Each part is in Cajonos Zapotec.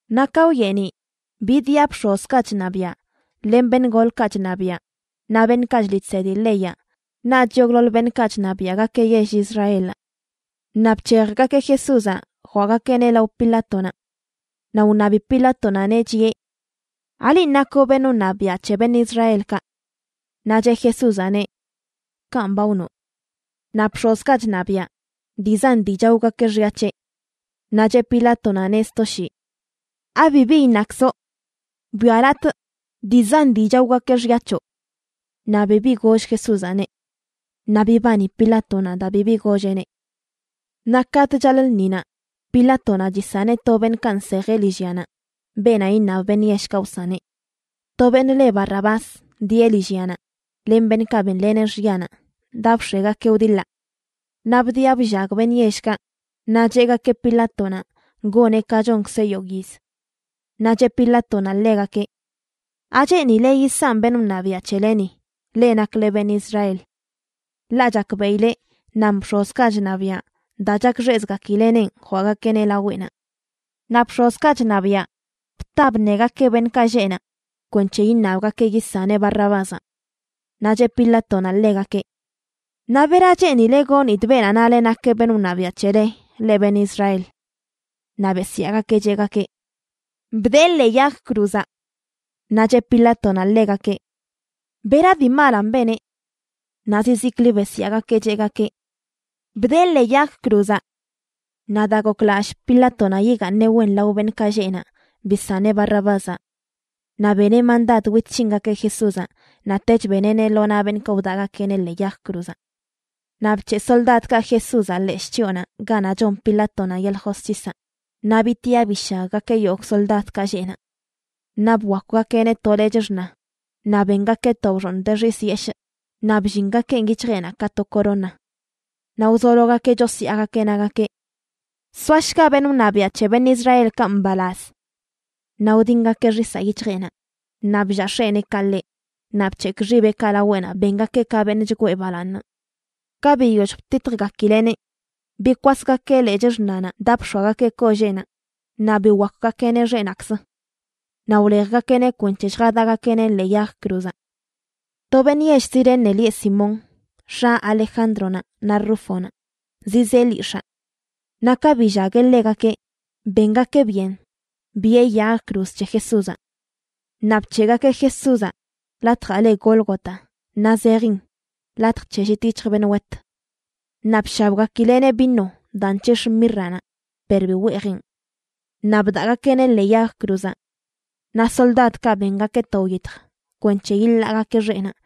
Naꞌ ka wyeeniꞌ bidiꞌa bx̱ozkaꞌ chṉabiaꞌ len beṉꞌ golkaꞌ chṉabiaꞌ, naꞌ beṉꞌkaꞌ chliꞌ chsedi leyaꞌ naꞌch yogꞌḻoḻ beṉꞌkaꞌ chṉabiaꞌgakeꞌ yell Israelaꞌ. Naꞌ bc̱hejgakeꞌ Jesúzaꞌ jwaꞌgakeꞌneꞌ lao Pilátonaꞌ. Naꞌ wṉabi Pilátonaꞌneꞌ, chiꞌe: ―¿Alinꞌ nakoꞌ beṉꞌ wṉabiaꞌ c̱he beṉꞌ Israelkaꞌ? Naꞌ cheꞌ Jesúzaꞌneꞌ: ―Kanꞌ ba wnoꞌ. Naꞌ bx̱ozkaꞌ chṉabiaꞌ dii zan dii chaogakeꞌ xya c̱heꞌ. Naꞌ cheꞌ Pilátonaꞌneꞌ sto shii: ―¿Abibi iṉakzoꞌ? Bwialatꞌ, dii zan dii chaogakeꞌ xya c̱hoꞌ. Naꞌ bibi goll Jesúzaꞌneꞌ. Naꞌ bibani Pilátonaꞌ daa bibi golleꞌneꞌ. Naꞌ katꞌ chaḻꞌ lṉinaꞌ, Pilátonaꞌ chisaneꞌ to beṉꞌkaꞌ nsejeꞌ lillyanaꞌ, beenaꞌ iṉab beṉꞌ yellkaꞌ wsaneꞌ. To beṉꞌ le Barrabás dieꞌ lillyanaꞌ len beṉꞌkaꞌ benleneꞌ xyanaꞌ daa bx̱egakeꞌ wdiḻaꞌ. Naꞌ bdiꞌa bllag beṉꞌ yellkaꞌ, naꞌ cheꞌgakeꞌ Pilátonaꞌ goneꞌ ka chonkzeꞌ yogꞌ yiz. Naꞌ cheꞌ Pilátonaꞌ ḻegakeꞌ: ― ¿Acheenile yisanꞌ beṉꞌ wṉabiaꞌ c̱heleni, leꞌ nakle beṉꞌ Israel? Ḻaꞌ chakbeꞌileꞌ nan bx̱ozkaꞌ chṉabiaꞌ daa chakxeꞌzgakileꞌnenꞌ jwaꞌgakeꞌneꞌ laweꞌnaꞌ. Naꞌ bx̱ozkaꞌ chṉabiaꞌ bta bṉegakeꞌ beṉꞌkaꞌ lleꞌ naꞌ kwenc̱he iṉabgakeꞌ yisaneꞌ Barrabázaꞌ. Naꞌ cheꞌ Pilátonaꞌ ḻegakeꞌ: ―Naꞌ bera cheenileꞌ gonidꞌ beenaꞌ nale nakeꞌ beṉꞌ wṉabiaꞌ c̱hele, leꞌ beṉꞌ Israel. Naꞌ besyaagakeꞌ cheꞌgakeꞌ: ―¡Bdee ḻee yag cruzaꞌ! Naꞌ cheꞌ Pilátonaꞌ ḻegakeꞌ: ―¿Bera dii malanꞌ beneꞌ? Naꞌ zizikli besyaagakeꞌ cheꞌgakeꞌ: ―¡Bdee ḻee yag cruzaꞌ! Naꞌ daa goklallꞌ Pilátonaꞌ yigaaṉeꞌ wen lao beṉꞌkaꞌ lleꞌ naꞌ, bisaneꞌ Barrabázaꞌ. Naꞌ beneꞌ mandad wit c̱hingakeꞌ Jesúzaꞌ, naꞌtech beneꞌneꞌ lo naꞌ beṉꞌkaꞌ wdaꞌgakeꞌneꞌ ḻee yag cruzaꞌ. Naꞌ bc̱heꞌ soldadkaꞌ Jesúzaꞌ leshꞌ chyoonaꞌ ganaꞌ chon Pilátonaꞌ yeḻꞌ josc̱hisaꞌ, naꞌ bitiꞌa bishaggakeꞌ yogꞌ soldadkaꞌ lleꞌ naꞌ. Naꞌ bwakwgakeꞌneꞌ to lechꞌ xṉa, naꞌ bengakeꞌ to bxooṉ de xis yeshꞌ naꞌ bllingakeꞌn yic̱hjeꞌnaꞌ ka to corona. Naꞌ wzologakeꞌ chosyaagakeꞌ nagakeꞌ: ―¡Soashga beṉꞌ wṉabiaꞌ c̱he beṉꞌ Israelkaꞌ mbalaz! Naꞌ wdingakeꞌ xisaꞌ yic̱hjeꞌnaꞌ, naꞌ bllaa x̱eneekaꞌ ḻeꞌ, naꞌ bc̱hekꞌ xibeꞌkaꞌ laweꞌnaꞌ bengakeꞌ ka beṉꞌ chgwee balaaṉ. Ka biyoll btitjgakileꞌneꞌ, bikwasgakeꞌ lechꞌ xṉanaꞌ daa bx̱oagakeꞌ kolleenaꞌ naꞌ biwakwgakeꞌneꞌ xeꞌnaꞌkzə. Naꞌ wlejgakeꞌneꞌ kwenc̱he lljadaꞌgakeꞌneꞌ ḻee yag cruzaꞌ. To beṉꞌ yell Cirene lieꞌ Simón, x̱a Alejándronaꞌ naꞌ Rúfonaꞌ, zizee lyix̱aa. Naꞌ ka billagueꞌ ḻegakeꞌ, bengakeꞌ byen biꞌe yag cruz c̱he Jesúzaꞌ. Naꞌ bc̱heꞌgakeꞌ Jesúzaꞌ latjaꞌ le Gólgota, naꞌ zejin: Latj c̱he llit yic̱hj beṉꞌ wet. Naꞌ bshabgakileꞌneꞌ vino daa nc̱hix̱ə mírranaꞌ, per bi weejeꞌn. Naꞌ bdaꞌgakeꞌneꞌ ḻee yag cruzaꞌ. Naꞌ soldadkaꞌ bengakeꞌ to wyitj kwenc̱he yiḻaagakeꞌ xeꞌnaꞌ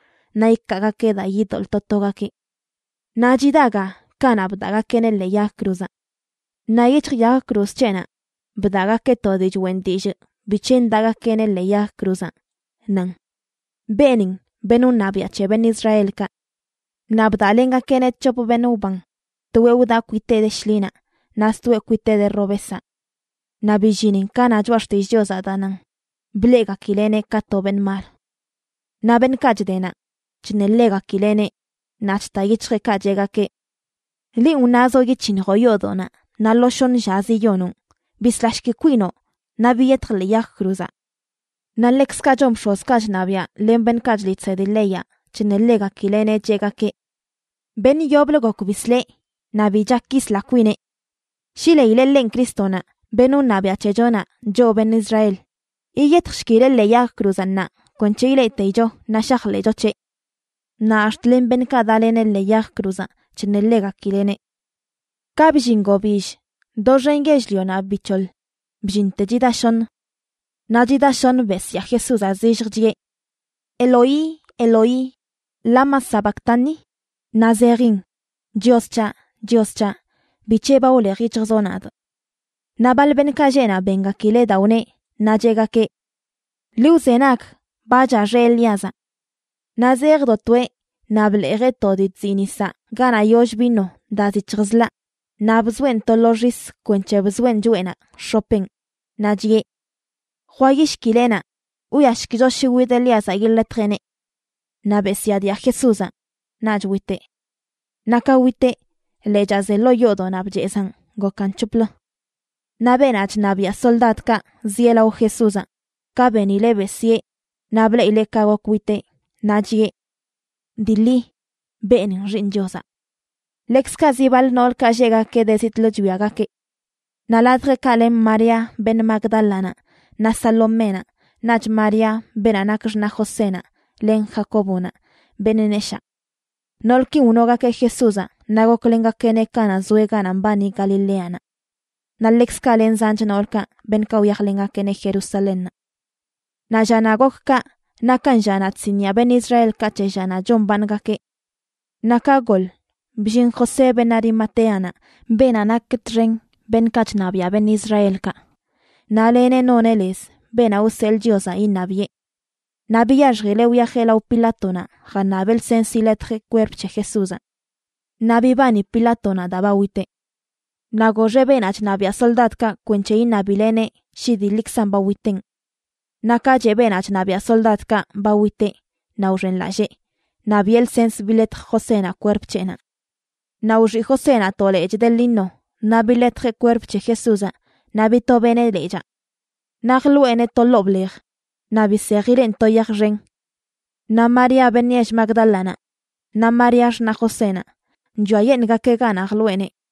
naꞌ ikaagakeꞌ daa yidoḻꞌ to togakeꞌ. Naꞌ chida ga kanaꞌ bdaꞌgakeꞌneꞌ ḻee yag cruzaꞌ. Naꞌ yic̱hj yag cruz c̱heꞌnaꞌ bdaꞌgakeꞌ to dii choꞌen dillꞌ bic̱he ndaꞌgakeꞌneꞌ ḻee yag cruzaꞌ, nan: “Beenin beṉꞌ wṉabiaꞌ c̱he beṉꞌ Israelkaꞌ.” Naꞌ bdaꞌlengakeꞌneꞌ c̱hop beṉꞌ wban, toeꞌ wdaꞌ kwiteꞌ de shḻinaꞌ, naꞌ stoeꞌ kwiteꞌ de robesaꞌ. Naꞌ billinin ka na Choꞌa Xtillꞌ Chiozaꞌ daa nan: “Bleꞌgakileneꞌ ka to beṉꞌ mal.” Naꞌ beṉꞌkaꞌ chde naꞌ, chṉeḻegakileꞌneꞌ, naꞌ chta yic̱hjeꞌkaꞌ cheꞌgakeꞌ: ―¡Linꞌ wnazoꞌ yic̱hiṉjoꞌ yoodoꞌnaꞌ naꞌ lo shoṉ llazə yiyonoꞌn, bislashki kwinoꞌ naꞌ biyetj ḻee yag cruzaꞌ! Naꞌ ḻekzkaꞌ chon bx̱ozkaꞌ chṉabiaꞌ len beṉꞌkaꞌ chliꞌ chsedi leyaꞌ, chṉeḻegakileꞌneꞌ, cheꞌgakeꞌ: ―Beṉꞌ yoblə gok bisleꞌ, naꞌ bi chak yisla kwineꞌ. Shi leileꞌ ḻenꞌ Crístonaꞌ, beṉꞌ wṉabiaꞌ c̱hechonaꞌ, choꞌ beṉꞌ Israel, yiyetjshkileꞌ ḻee yag cruzaꞌ ṉaa kwenc̱he ileꞌteicho naꞌ shajḻeꞌcho c̱heꞌ. Naꞌ ax̱t len beṉꞌkaꞌ daꞌleneꞌ ḻee yag cruzaꞌ chṉeḻegakileꞌneꞌ. Ka bllin gobill, doxen yell-lionaꞌ bic̱hoḻ, bllinte chida shoṉ. Naꞌ chida shoṉ besyaa Jesúzaꞌ zillj, chiꞌe: ―Eloí, Eloí, ¿lama sabactani?a ―naꞌ zejin: Chios c̱haꞌ, Chios c̱haꞌ, ¿bic̱he ba wlej yic̱hjzoꞌ nadꞌ? Naꞌ baḻ beṉꞌkaꞌ lleꞌ naꞌ bengakileꞌ daa wneꞌ naꞌ cheꞌgakeꞌ: ―Ḻi wzenag, ba chaxeꞌ Elíazaꞌ. Naꞌ zejdo toeꞌ naꞌ bḻeejeꞌ to dii chziꞌ nisaꞌ ganaꞌ yollə vino daa zic̱hj zḻaꞌ naꞌ bzoeꞌn to lo xis kwenc̱he bzoeꞌn choꞌenaꞌ x̱opeꞌn, naꞌ chiꞌe: ―Jwayishkileꞌnaꞌ, wwiashkicho shi wid Elíazaꞌ yiḻetjeꞌneꞌ. Naꞌ besyaadia Jesúzaꞌ, naꞌch witeꞌ. Naꞌ ka witeꞌ, lechaa ze ḻoo yoodoꞌnaꞌ bchezaꞌn gokan c̱hoplə. Naꞌ beenaꞌ chṉabiaꞌ soldadkaꞌ zieꞌ lao Jesúzaꞌ, ka benileꞌ besyee naꞌ bleꞌileꞌ ka gok witeꞌ, naꞌ chiꞌe: ―Dii ḻi beenin Xiiṉ Chiozaꞌ. Ḻekzkaꞌ zi baḻ noolkaꞌ lleꞌgakeꞌ de zitꞌlə chwiagakeꞌ. Naꞌ ladjeꞌkaꞌ len María beṉꞌ Magdálanaꞌ, naꞌ Saloménaꞌ, naꞌch María, beenaꞌ nak x̱naꞌ Josénaꞌ len Jacóbonaꞌ, beṉꞌ neshaa. Noolkin wnogakeꞌ Jesúzaꞌ naꞌ goklengakeꞌneꞌ kanaꞌ zoeꞌ ganaꞌ mbani Galileanaꞌ. Naꞌ ḻekzkaꞌ len zanch noolkaꞌ beṉꞌkaꞌ wyajlengakeꞌneꞌ Jerusalénnaꞌ. Naꞌ llanaꞌ gok kaꞌ nakan llanaꞌ chsiniꞌa beṉꞌ Israelkaꞌ c̱he llanaꞌ chombaaṉgakeꞌ. Naꞌ ka goḻ, bllin José beṉꞌ Arimatéanaꞌ, beenaꞌ nak txen beṉꞌkaꞌ chṉabiaꞌ beṉꞌ Israelkaꞌ, naꞌ leneꞌ noneꞌ lez beenaꞌ wseḻꞌ Chiozaꞌ iṉabiꞌe. Naꞌ biyaxjileꞌ wyajeꞌ lao Pilátonaꞌ jaṉabeꞌ lsens yiḻetjeꞌ kwerp c̱he Jesúzaꞌ. Naꞌ bibani Pilátonaꞌ daa ba witeꞌ. Naꞌ goxeꞌ beenaꞌ chṉabiaꞌ soldadkaꞌ kwenc̱he iṉabileneꞌ shi dii ḻikzan ba witenꞌ. Naꞌ ka cheꞌ beenaꞌ chṉabiaꞌ soldadkaꞌ ba witeꞌ naꞌ wxenlallee, naꞌ biꞌe lsens biḻetj Josénaꞌ kwerp c̱heꞌnaꞌ. Naꞌ wxiꞌ Josénaꞌ to lechꞌ de lino naꞌ biḻetjeꞌ kwerp c̱he Jesúzaꞌ naꞌ bitobeꞌneꞌ lechaa. Naꞌ jḻoꞌeneꞌ to ḻoo blej, naꞌ bisejileꞌn to yaj xen. Naꞌ María beṉꞌ yell Magdálanaꞌ, naꞌ María, xṉaꞌ Josénaꞌ, chwiayeṉꞌgakeꞌ ganaꞌ jḻoꞌeneꞌ.